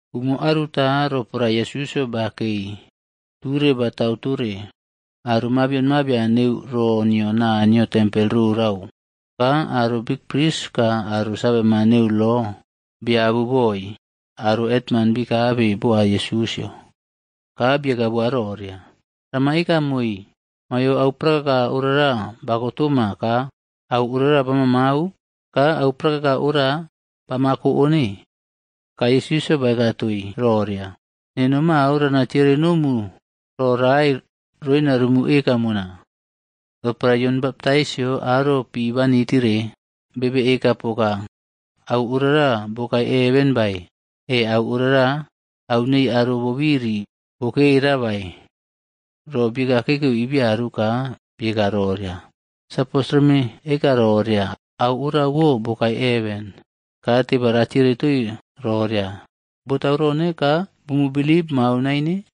Umo aruta, roporae Yesusꞌyo bakei ture batau tore aro mabion mabian neu ro nio Naniyo tempel rorau. Ka aro bikpris ka aro saveman neu lo, biabu boi aro hetman bikabe boa Yesusꞌyo. Ka bieka boa roria, “Rama eka moii, maiyo au prakaka orara bako toma ka au ora bamaꞌmau? Ka au prakaka ora bamako one?” Ka Yesusꞌyo baeka toii roria, “Neno mao rana tiere nomu ro rae roina rumu eka mona. Roporae Yon Baptais aro pi banitire, bebe eka poka au orara bokae heven bae, e au orara au nei aro bobiri bokera bae?” Ro biekaꞌkekeu i biaru ka bieka roria, “Sapos reme eka roria, ‘Au orawo bokae heven,’ ka teba ratiere toi roria, ‘Botau rone ka bumu bilip moa naine?’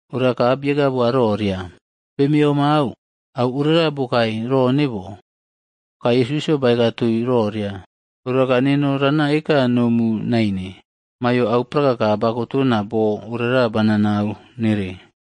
Ora ka bieka boa roria, “Bemeꞌomau au orara bokae rone bo.” Ka Yesusꞌyo baeka toii roria, “Ora ka neno rana eka nomu naine maiyo au prakaka bakotona boo orara banaꞌnau nere.”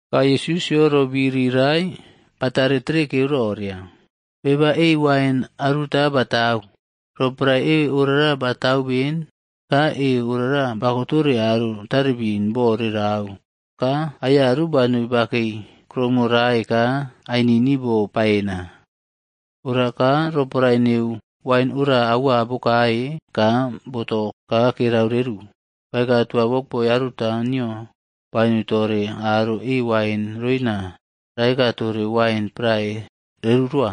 Ka Yesusꞌyo ro biri rae batare terekeu roria, “Beba e wain aruta batau. Roporae e orara batau ben, ka e orara bako tore aro tarebin bo rerau, ka aiyaru banoi bakei kuroumo rae ka ainini bo paena. Ora ka roporae neu wain ora auaꞌbokae ka boto ka kerau reru, baeka toa wokboi aruta nio banoi tore aro e wain roina raeka tore wain prae reru rowa.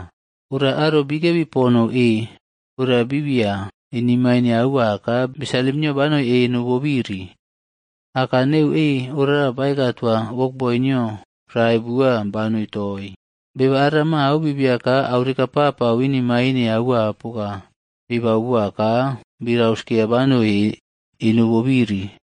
Ora aro bikebi ponou e ora biꞌbiya inemaine aua ka bi salim nio banoi eno bobiri. Aka neu e orara baeka toa wokboi nio rae bua banoi toii. Beba ara mao bibia ka au rekaꞌpapau inemain aua poka, bibau boa ka bi rauskeya banoi eno bobiri.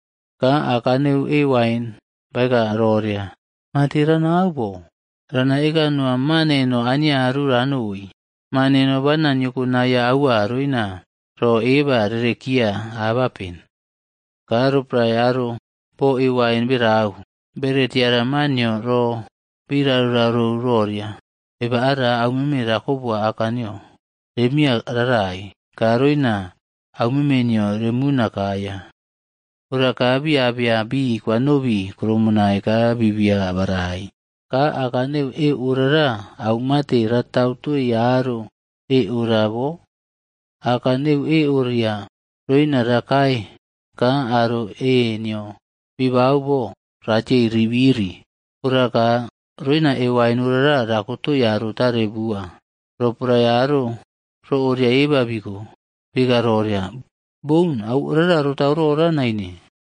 “Ka aka neu e wain baeka roria, ‘Mate ranau bo? Rana eka noa ma neno aniaru ranoi. Ma neno bana niyokonaiya aua roina ro eba rerekiya abapen.’ “Ka roporae aro bo e wain berau, bere tiara ma nio ro bi rarouꞌrarou roria. ‘Beba ara aumeme rako boa aka nio. Rem miya raꞌrai, ka roina aumeme nio remuna kaiya.’ Ora ka bi abeya bi kwanobi e wain krumonai ka bibiya barai. Ka aka neu e orara au mate ratau toii aro e ora bo? Aka neu e oria roina rakae ka aro e nio bibau bo ratiei rirabi. Ora ka roina e wain orara rakotoi aro tare bua.” Roporae aro ro oria eba biko, bieka roria, “Boun! Au orara rotau rora naine.”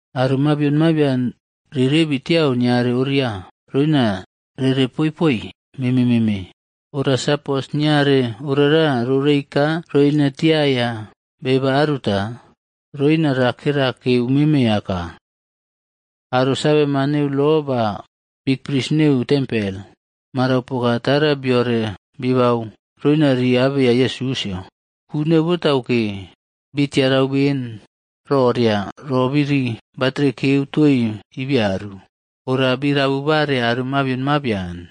Aro mabion mabian rirebi tiau niare oria, roina rere poiꞌpoi meme meme. Ora sapos niare orara rorei ka roina tiaya beba aruta, roina ra kerakeu meme aka.” Aro saveman neu lo ba bikpris neu tempel, marau poka tara biore bibau roina ri abeya Yesusꞌyo. Ku neu botauke, bii tiarau ben roria ro biri batrekeu toii ibiaru. Ora bi rabu bare aro mabion mabian.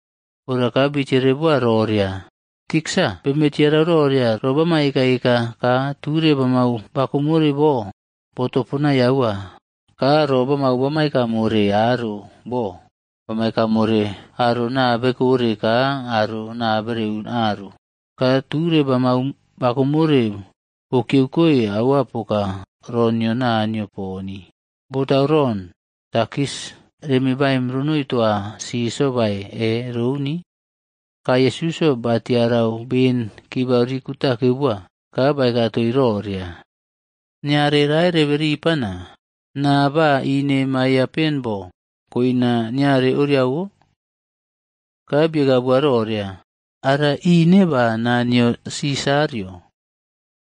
Ora ka bitiere boa roria, “Tiksa beme tiarau roria ro bama ekaꞌeka ka ture bamau bakomore bo. Botoponai aua. Ka ro bamau bama eka more aro bo, bama eka more aro naa bekore ka aro naa bereun aru. Ka ture bamau bakomore bokiyeukoi aua poka ro nio Naniyo poni. Botau ron, takis reme baim ronoi toa Sisarꞌyo bae e rouni?” Ka Yesusꞌyo batiarau ben kibau ri kutakeu boa, ka baeka toi roria, “Niare rae rebe ripana. Naa ba ine maiyaꞌpen bo koina niare oriawo?” Ka bieka bua roria, “Ara ine ba naa nio Sisarꞌyo.”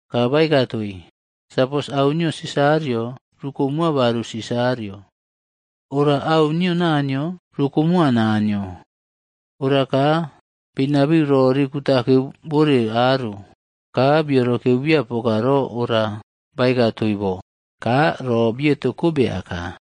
Ka baeka toii, “Sapos au nio Sisarꞌyo, rukomoa baru Sisarꞌyo. Ora au nio Naniyo, rukomoa Naniyo.” Ora ka binabiu ro ri kutakeu bore aro. Ka biorokeuꞌbiya poka ro ora baeka toii bo, ka ro bieto kobe aka.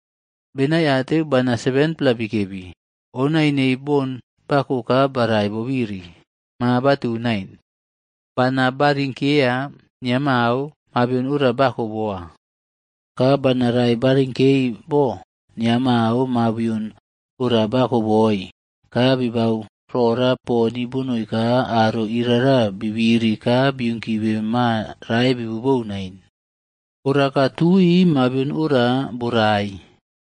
Benaiateu bana 7-pla bikebi. Onai neii bon bako ka barai bobiri, ma batau nain. Bana ba rinkeya nia mao mabion ora bako boa. Ka bana rae barinkei bo nia mao mabion ora bako boi, ka bi bau rora poni bonoi ka aro irara bi biri ka biunkibe ma rae bibu bou nain. Ora ka tui mabion ora borai.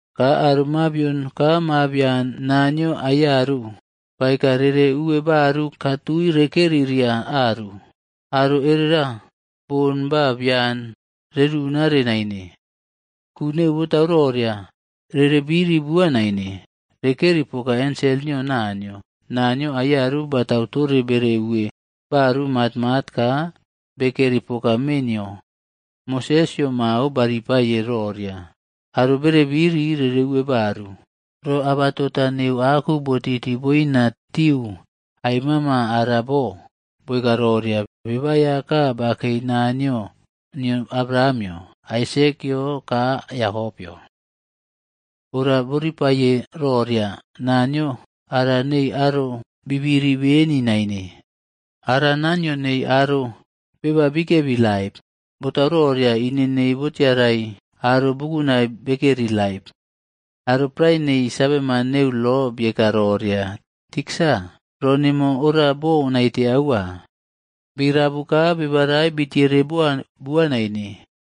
Ka aro mabion ka mabian Naniyo aiyaru baeka rere uwe baru ka tui rekeri ria aru, aro erera bon ba bian rerunare naine. Ku neu botau roria, rere biri bua naine. Rekeri poka ensel nio Naniyo. Naniyo aiyaru batau tore bere uwe baru matmat ka bekeri poka mee nio. Mosesꞌyo mao ba ripaye roria, aro bere biri rere uwe baru, ro abatota neu aku botiti boina tiu ai mama ara bo, boeka roria, ‘Beba Aiyaka bakei Naniyo nio Abrahamꞌyo, Aisekꞌyo, ka Yakopꞌyo.’ Ora boripaiye roria, Naniyo ara neii aro bibiri beni naine. Ara Naniyo neii aro beba bikebi laip, botau roria ine nio botiarai aro bukunai bekeri laip.” Aro prae nei saveman neu lo bieka roria, “Tiksa, ro nemo ora bo naite aua.” Bi rabu ka beba rae bitiere boa bua naine.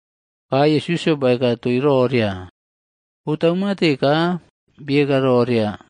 Ka Yesusꞌyo baeka toi roria, “Botau mate ka bieka roria,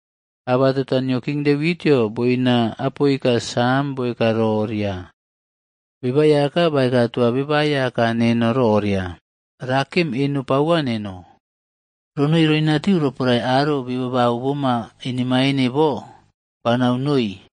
Abatota nio King Devitꞌyo boina Apoika Sam boeka roria, ‘Beba Aiyaka baeka toa Beba Aiyaka neno roria, “Ra kem eno pauwa neno, ronoi roinatiu roporae aro bi babau boma inemaine bo banau noi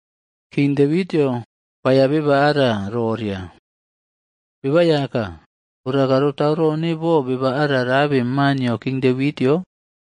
King Devitꞌyo baeiya beba ara roria, ‘Beba Aiyaka.’ Ora ka rotau rone bo beba ara rabe ma nio King Devitꞌyo?”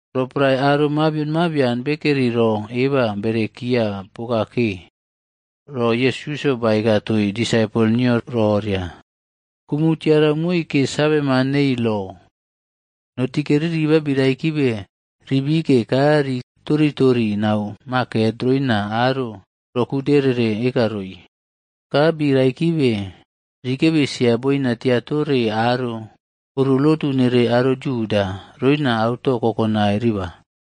Roporae aro mabion mabian bekeri ro eba berekiya poka ke, ro Yesusꞌyo baeka toii disaipol nio roria, “Kumu tiarau moi ke saveman nei lo. Notike riribaf bi raikibe ri bike ka ri toriꞌtori nau maket roina aro ro gude rere eka roi. Ka bi raikibe rikebi sia boina tia tore aro oro lotu nere aro Yuda, roina auto kokonai riba.